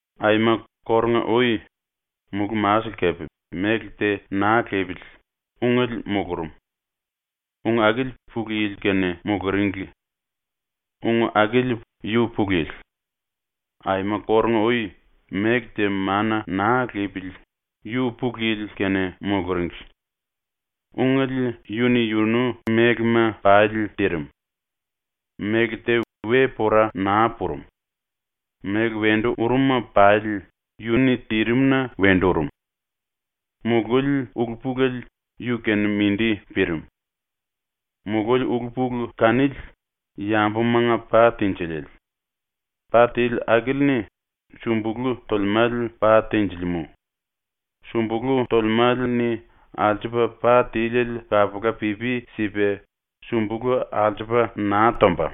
Aima kórunga-ui, ⸤mulú-masele kepe méle te naa lipili,⸥ Ungele mulurum. Ung akili Pulu Yili-kene muluringli. Ung akili yu Pulu Yili. Aima kórunga-ui, méle te mana naa lipili, yu Pulu Yili-kene muluringli. Ungele yu-ni yunu mélema pali tirim. Méle te we pora naa purum. Méle wendu urum-ma pali yu-ni tirim-na wendu urum. Mululi ulu-pulele yu-kene mindi pirim. Mululi ulu-pulu kanili yambumanga pa tinjiliele. Pa tili akili-ni sumbulú tolemále pa tenjilimú. Sumbulú tolemále-ni alsupa pa tiliele kapula pipi sipa sumbulú alsupa naa tomba.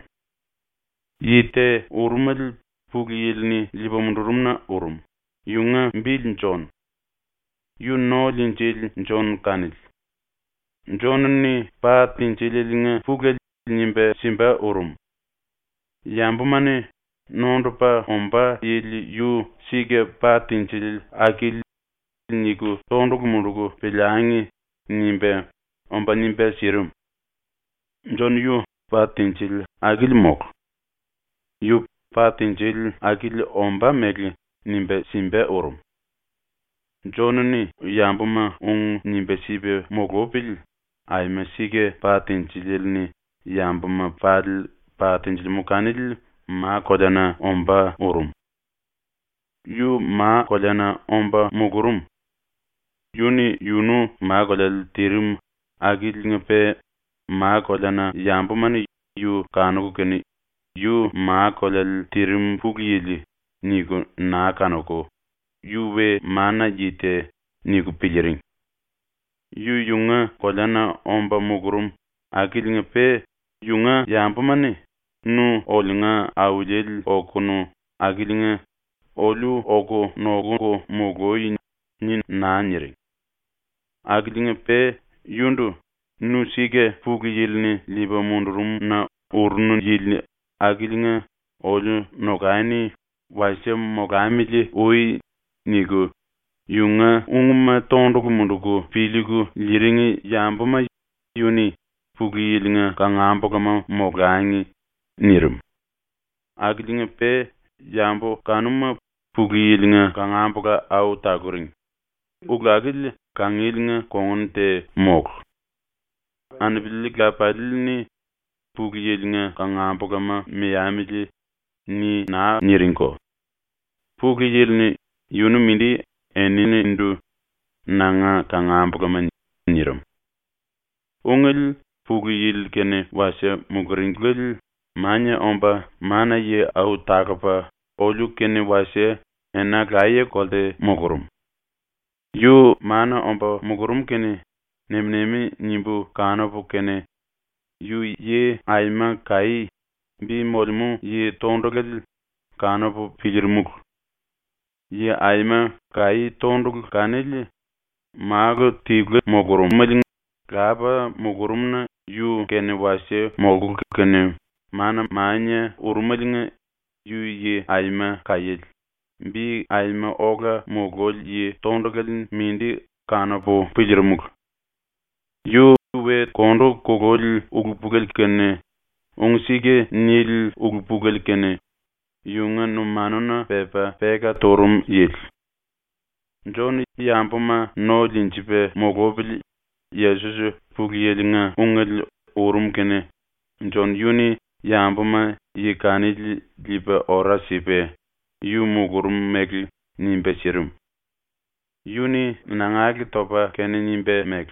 Yi te urumele Pulu Yili-ni liipa mundurum-na urum, yunga bili Jon. ⸤Yu No-Liinjili Jon kanili.⸥ Jon-ni pa tinjilieliinga pulele nimba simba urum. ‘Yambuma-ni “Nondupa ombá yili yu sika pa tinjili akili.” niku tondulu munduku piliangi.’ nimba, omba nimba sirim. Jon yu pa tinjili akili mólu. Yu pa tinjili akili ombá mele nimba simba urum. Jon-ni yambuma ung nimba sipa mulupili aima sika pa tinjiliele-ni yambuma pali pa tenjilimú kanili ma-koleana ombá urum. Yu ma-koleana omba mulurum. Yu-ni yunu ma-koleale tirim akiliinga-pe ma-koleana yambuma-ni yu kanuku kene ‘Yu ma-koleale tirim Pulu Yili.’ niku naa kanuku ‘Yu we mana-yi te.’ niku piliiring. Yu yunga koleana omba mulurum akiliinga-pe yunga yambuma-ni “Nu oliunga Auliele okonu akiliinga oliu oku nokuku mului.” ni naa niring. Akiliinga-pe yundu “Nu sika ⸤Pulu Yili-ni liipa mundurum-na urunu yili akiliinga⸥ oliu nokani wasie molamili ui.” niku yunga ungma tondulu munduku piliiku liiring yambuma yu-ni “Pulu Yili-nga kangambulama molangi.” nirim. Akiliinga-pe yambu kanuma Pulu Yili-nga kangambula au taluring, ulu akili kangieliinga kongun te mólu. Anupili lapalii-ni “Pulu Yili-nga kangambulama meamili.” ni naa niringko. Pulu Yili-ni yunu mindi eninindu “Nanga kangambulama.” nirim. Ungele ⸤Pulu Yili kene wasie muluringliele⸥ mania omba mana-yi au talupa oliu-kene wasie ena laye-kolte mulurum. Yu mana omba mulurum kene nem-nemi nimbu kanupu kene, yu yi aima kaí, bi molemú yi tondulale, kanupu piliirimulu. Yi aima kaí tondulu kanili Málu tiluele mulurum Lapa mulurumna yu-kene wasie molkulu kene mana-mania urumeliinga yu yi aima kaíele, bi aima ola mululi yi tondulale mindi kanupu piliirimulu. Yu we kondu kululi ulu-pulele kene ung-sika nili ulu-pulele kene yunga numanuna pepa peka turum yili. ⸤Jon yambuma no liinjipa mulupili Yesos Pulu Yili-nga Ungele urum kene⸥ Jon yu-ni yambuma yi kanili liipa ora sipa yu mulurum mele nimba sirim. Yu-ni nangale topa kene nimba mele: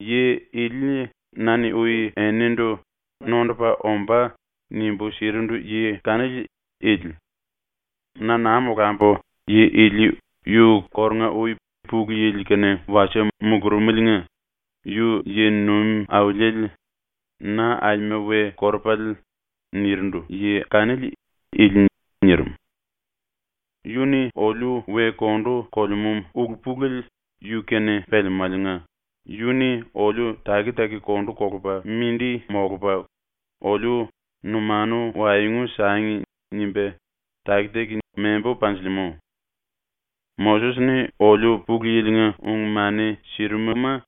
“Yi ili na-ni ui enindu “Nondupa ombá.” nimbu sirindu yi kanili ili. Na naa molambu yi ili yu kórunga-ui Pulu Yili-kene wasie mulurumeliinga “Yu yi-nuim auliele, na aima we korupale.” nirindu yi kanili ili.” nirim. Yu-ni oliu we kondu kolemú ulu-pulele yu-kene pelemáliinga yu-ni oliu taki-taki kondu kolupa mindi molupa oliu ‘Numanu waengu sangi.’ nimba taki-taki membu panjilimú. Moses-ni oliu Pulu Yili-nga ung-mani sirimuma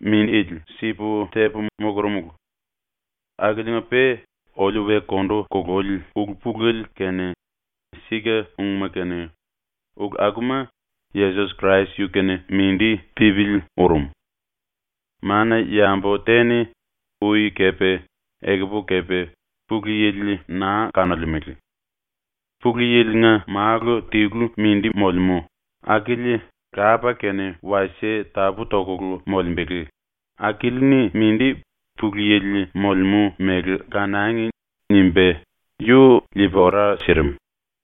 mindili sipu tepu mulurumulu. Akiliinga-pe oliu we kondu kululi ulu-pulele kene sika-ungma kene ulu akuma Yesos Krais yu-kene mindi pípili urum. Mana-yambu te-ni ui kepe, ekupu kepe, Pulu Yili naa kanolemele. Pulu Yili-nga Málu tilu mindi molemú, akili Lapa-kene wasie tapú-toku molembele, akili-ni mindi ‘Pulu Yili molemú mele kanangi.’ nimba yu liipa ora sirim.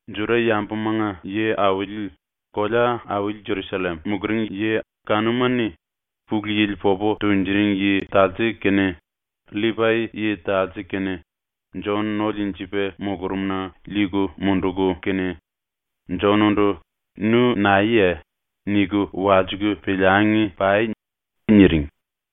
Juda-yambuma⸤nga yi-auli⸥ kolea-auli Jerusallem muluring ⸤yi kanuma-ni⸥ Pulu Yili popu tunjuring yi talse kene, LLipai-yi talse kene Jon no liinjipa mulurumna liiku munduku kene, “Jon-ndu “Nu naeye?” niku walsiku piliangi pai.” niring.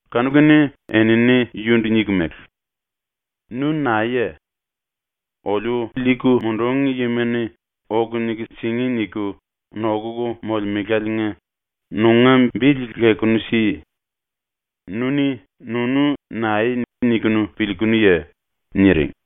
Kanu-kene enini yundu niku mele: “Nu naeye? Oliu liiku mundúngi yima-ni ‘Oku niku singí.’ niku nokuku molemeláliinga nunga bili lekunu si. Nu-ni nunu nae niku piliikunuye?” niring.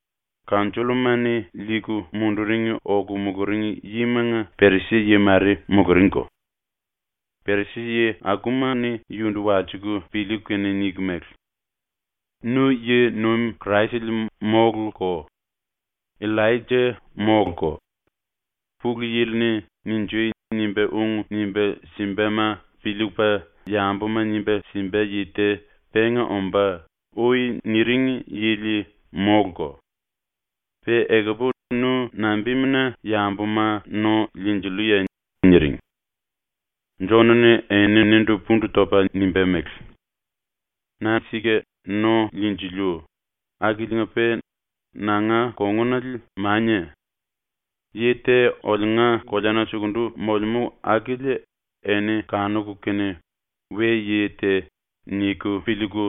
⸤Kanjolloma-ni⸥ liiku munduring oku muluring yimanga Perisi-yi mare muluringko. Perisi-yi akuma-ni yundu walsiku piliiku kene niku mele: “Nu yi-nuim Kraisele móluko, Illaija móluko, ‘Pulu Yili-ni “Ninjui!” nimba ung nimba simbama piliipa yambuma nimba simba yi te penga ombá.’ ui niring yili móluko. Pe ekupu nu nambimuna yambuma no liinjilluye?” niring. Jon-ni eninindu pundu topa nimba mele: “Na sika no liinjiliu akiliinga-pe nanga kongunale mania. Yi te oliunga koleana sukundu molemú akili eni kanuku kene ‘we-yi te’ niku piliiku,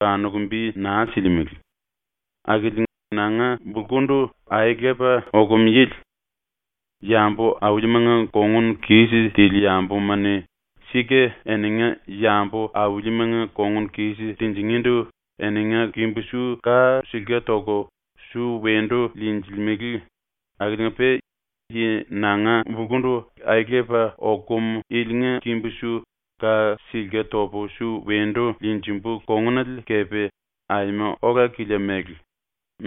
kanuku bi naa silimele, akili nanga bulkundu aelepa okum yili. ⸤Yambu-aulimanga kongun kis tili yambuma-ni sika eninga yambu-aulimanga kongun kis tinjingíndu eninga kimbu-su ka silke toku su wendu liinjilimele akiliinga-pe⸥ yi nanga bulkundu aelepa okum ilinga kimbu-su ka silke topu su wendu liinjimbu kongunale kepe aima ola-kilia mele,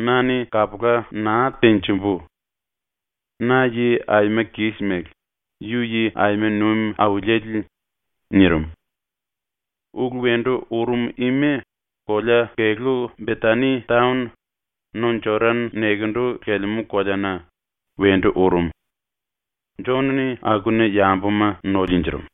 na-ni kapula naa tenjimbu. Na yi aima kis mele; yu yi aima nuim auliele.” nirim. Ulu wendu urum ima kolea-kelú Betani taon, no Jodan nekendu lelemú koleana, wendu urum. Jon-ni akuna yambuma no liinjirim.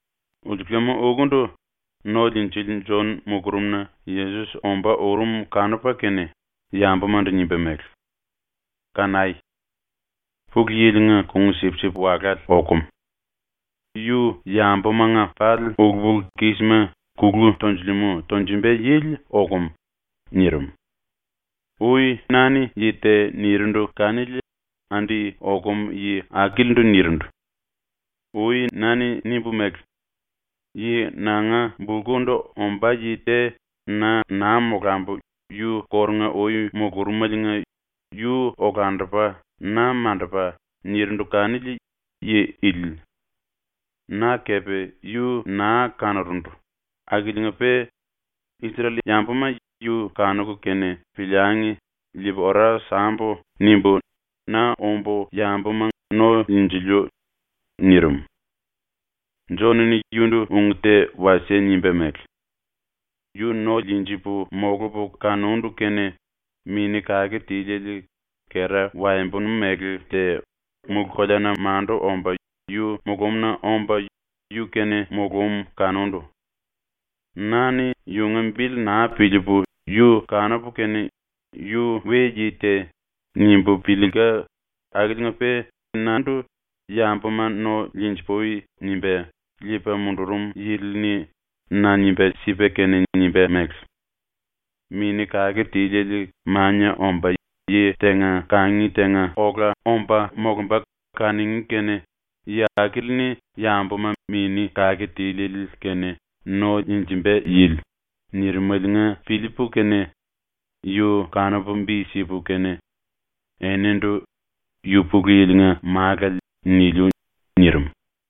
Ulsulam-ukundu ⸤No-Liinjili⸥ Jon mulurumna Yesos ombá urum kanupa kene, yambumandu nimba mele: “Kanai! Pulu Yili-nga Kung-Sipsip Walále okum. Yu yambumanga pali ulu-pulu-kísima kulu tonjulemú tonjumba yili okum.” ⸤nirim⸥. “Ui na-ni yi te nirindu kanili andi okum yi akilindu nirindu. Ui na-ni nimbu mele: “Yi nanga bulkundu ombá yi te na naa molambu yu kórunga-ui mulurumeliinga yu olandupa na mandupa.” nirindu kanili yi ili. Na kepe yu naa kanurundu akiliinga-pe ‘Isrel-yambuma yu kanuku kene piliangi liipu ora sambu.’ nimbu na ombu yambuma no liinjiliu.” nirim. Jon-ni yundu ung te wasie nimba mele: “Yu no liinjipu molupu kanundu kene Mini ⸤Kake Tiliele⸥ kera waembonu mele te mulú-koleana mandu omba yu mulumna omba yu-kene mulúm kanundu. Na-ni yunga bili naa piliipu yu kanupu kene ‘Yu we-yi te.’ nimbu piliilka akiliinga-pe nandu “Yambuma no liinji-pui.” nimba liipa mundurum yili-ni na nimba sipa kene nimba mele: “Mini ⸤Kake Tiliele⸥ mania omba yi tenga kangi tenga ola omba molumba kanuní kene yi akili-ni yambuma Mini ⸤Kake Tiliele⸥-kene no liinjimba yili.” nirimeliinga piliipu kene yu kanupu bi sipu kene enindu “Yu Pulu Yili-nga Málale.” niliu.” nirim.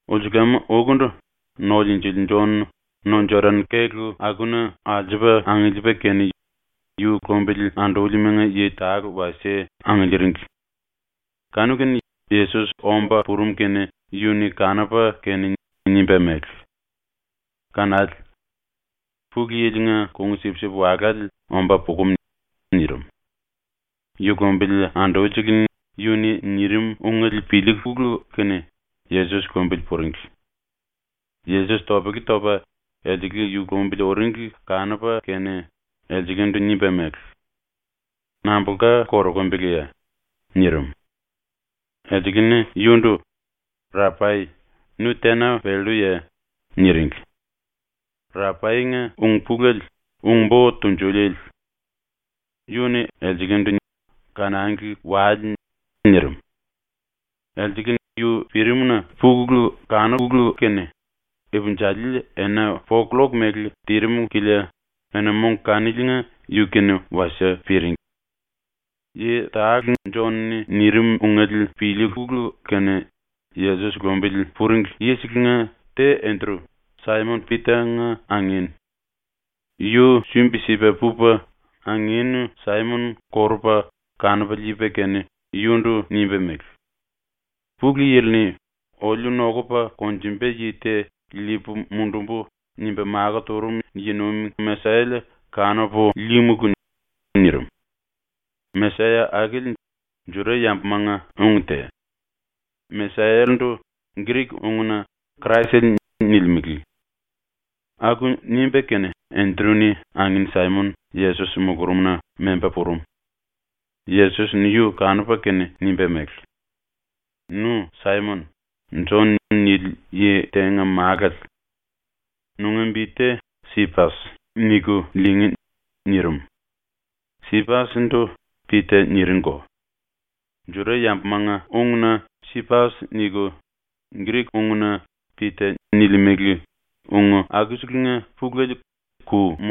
Ulsulam-ukundu ⸤No-Liinjili⸥ Jon no-Jodan kélu akuna alsupa angiliipa kene, yu lumbili andúlimanga yi tale wasie angiliiring. Kanu-kene Yesos omba purum kene yu-ni kanupa kene nimba mele: “Kanale! Pulu Yili-nga Kung-Sipsip Walále omba pukum.” nirim. Yu lumbili andulisele yu-ni nirim ungele piliikulu kene Yesos lumbili puringli. Yesos topele topa elsele yu lumbili uringli kanupa kene elselendu nimba mele: “Nambulka korokumbeleye?” nirim. Elsele-ni yundu “Rapai, nu tena pelluye?” niringli. (Rapainga ung-pulele ‘Ung-Bo Tunjuliele’.) Yu-ni elselendu “Kanangli wale.” nirim. Elsele yu pirimna puku kanukulu kene ipinjali ena po-killok mele tirim kilia ena-mong kaniliinga yu-kene wasie piring. Yi tale Jon-ni nirim ungele piliikulu kene Yesos lumbili puringli yiselenga te Endru, Saimon-Pita-nga angin. Yu sumbi-sipa pupa angin Saimon korupa kanupa liipa kene yundu nimba mele: “Pulu Yili-ni “oliu nokupa konjumba yi te liipu mundumbu.” nimba makó turum yi-nuim Mesayale kanupu líímulu.” nirim. (‘Mesaya’ akili Juda-yambumanga ung te. Mesayale-ndu Grik-ungna ‘Kraisele’ nilimele.) Aku nimba kene Endru-ni angin Saimon Yesos mulurumna memba purum. Yesos-ni yu kanupa kene nimba mele: “Nu Saimon, ‘Jon’ nili yi tenga málale. Nunga bi te ‘Sipas’ niku lingí.” nirim. (Sipas-ndu ‘Pita’ niringko. Juda-yambumanga ungna ‘Sipas’ niku, Grik-ungna ‘Pita’ nilimele, ung akuselenga pulele ‘ku’.)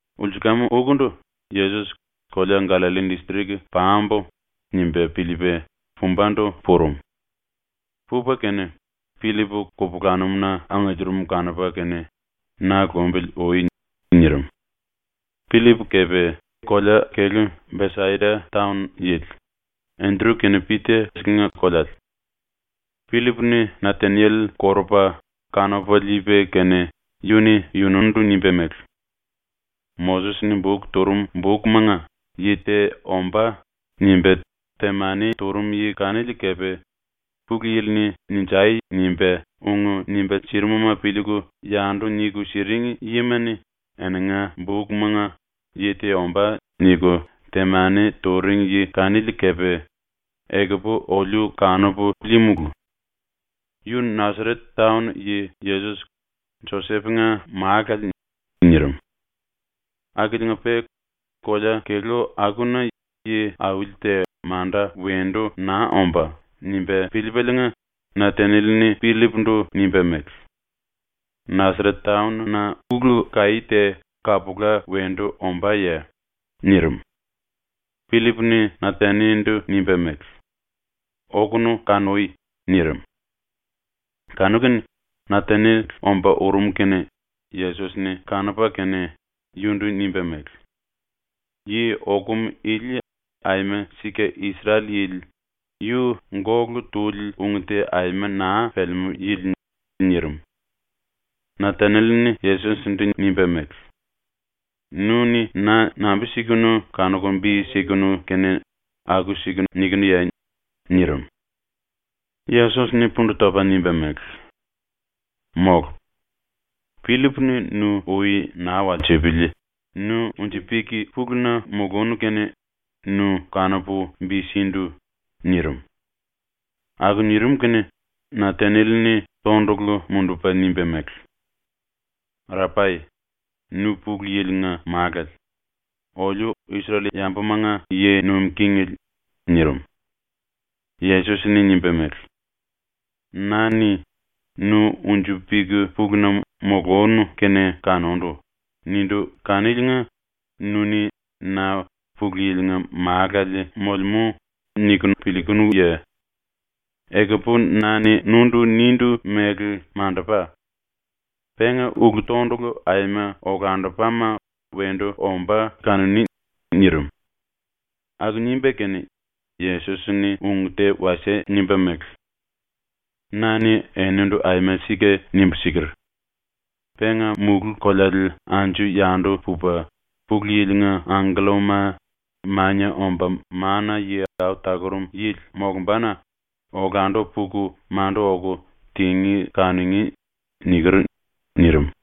Ulsulam-ukundu Yesos ‘Kolea Gallalli distrik pambu.’ nimba piliipa pumbandu purum. Pupa kene Pillip kupulanum-na angiliirim kanupa kene, “Na lumbili ui.” nirim. Pillip kepe kolea-kelú Besaida taon yili, Endru kene Pita-selenga koleale. Pillip-ni Nataniel korupa kanupa liipa kene yu-ni yunundu nimba mele: “Moses-ni buk turum bukmanga ‘Yi te ombá.’ nimba temani turum yi kanili kepe, Pulu Yili-ni “Ninjai!” nimba ung nimba sirimuma piliiku yandu niku siring yima-ni eninga bukmanga ‘Yi te ombá.’ niku temani turing yi kanili kepe, ekupu oliu kanupu líímulu. Yu Nasaret taon yi Yesos, Josep-nga málale.” nirim. ⸤Akiliinga-pe ‘Kolea kelú akuna yi-auli te manda wendu naa ombá.’ nimba piliipaliinga⸥ Nataniel-ni Pillip-ndu nimba mele: “Nasaret taon-na ulu-kaí te kapula wendu ombáye?” nirim. Pillip-ni Nataniel-ndu nimba mele: “Okunu kanui.” nirim. Kanu-kene Nataniel ombá urum kene Yesos-ni kanupa kene, yundu nimba mele: “Yi okum ili aima sika Isrel-yili, yu gólu tuli ung te aima naa pelemú yili.” nirim. Nataniel-ni Yesos-ndu nimba mele: “Nu-ni na nambi-sikunu kanuku bi sikunu kene aku-siku nikinuye?” nirim. Yesos-ni pundu topa nimba mele: “Mólu. Pillip-ni nu ui naa walsipili nu unji-pik puluna mulunu kene nu kanupu bi sindu.” nirim. Aku nirim kene Nataniel-ni tondulu mundupa nimba mele: “Rapai, nu Pulu Yili-nga Málale, oliu Isrel-yambumanga yi nuim kingele.” nirim. Yesos-ni nimba mele: “Na-ni ‘Nu unji-pik puluna mulunu kene kanundu.’ nindu kaniliinga nu-ni na ‘Pulu Yili-nga Málale molemú.’ niku piliikunuye? Ekupu na-ni nundu nindu mele mandupa. Penga ulu-tondulu aima olandupama wendu ombá kanuní.” nirim. Aku nimba kene Yesos-ni ung te wasie nimba mele: “Na-ni enindu aima sika nimbu siker: “Penga mulú-koleale anju-yandu pupa, Pulu Yili-nga angkellama Mania Omba Mana-Yi Au Talurum Yili molumbana olandu puku mandu oku tingí kanungí.” niker.” nirim.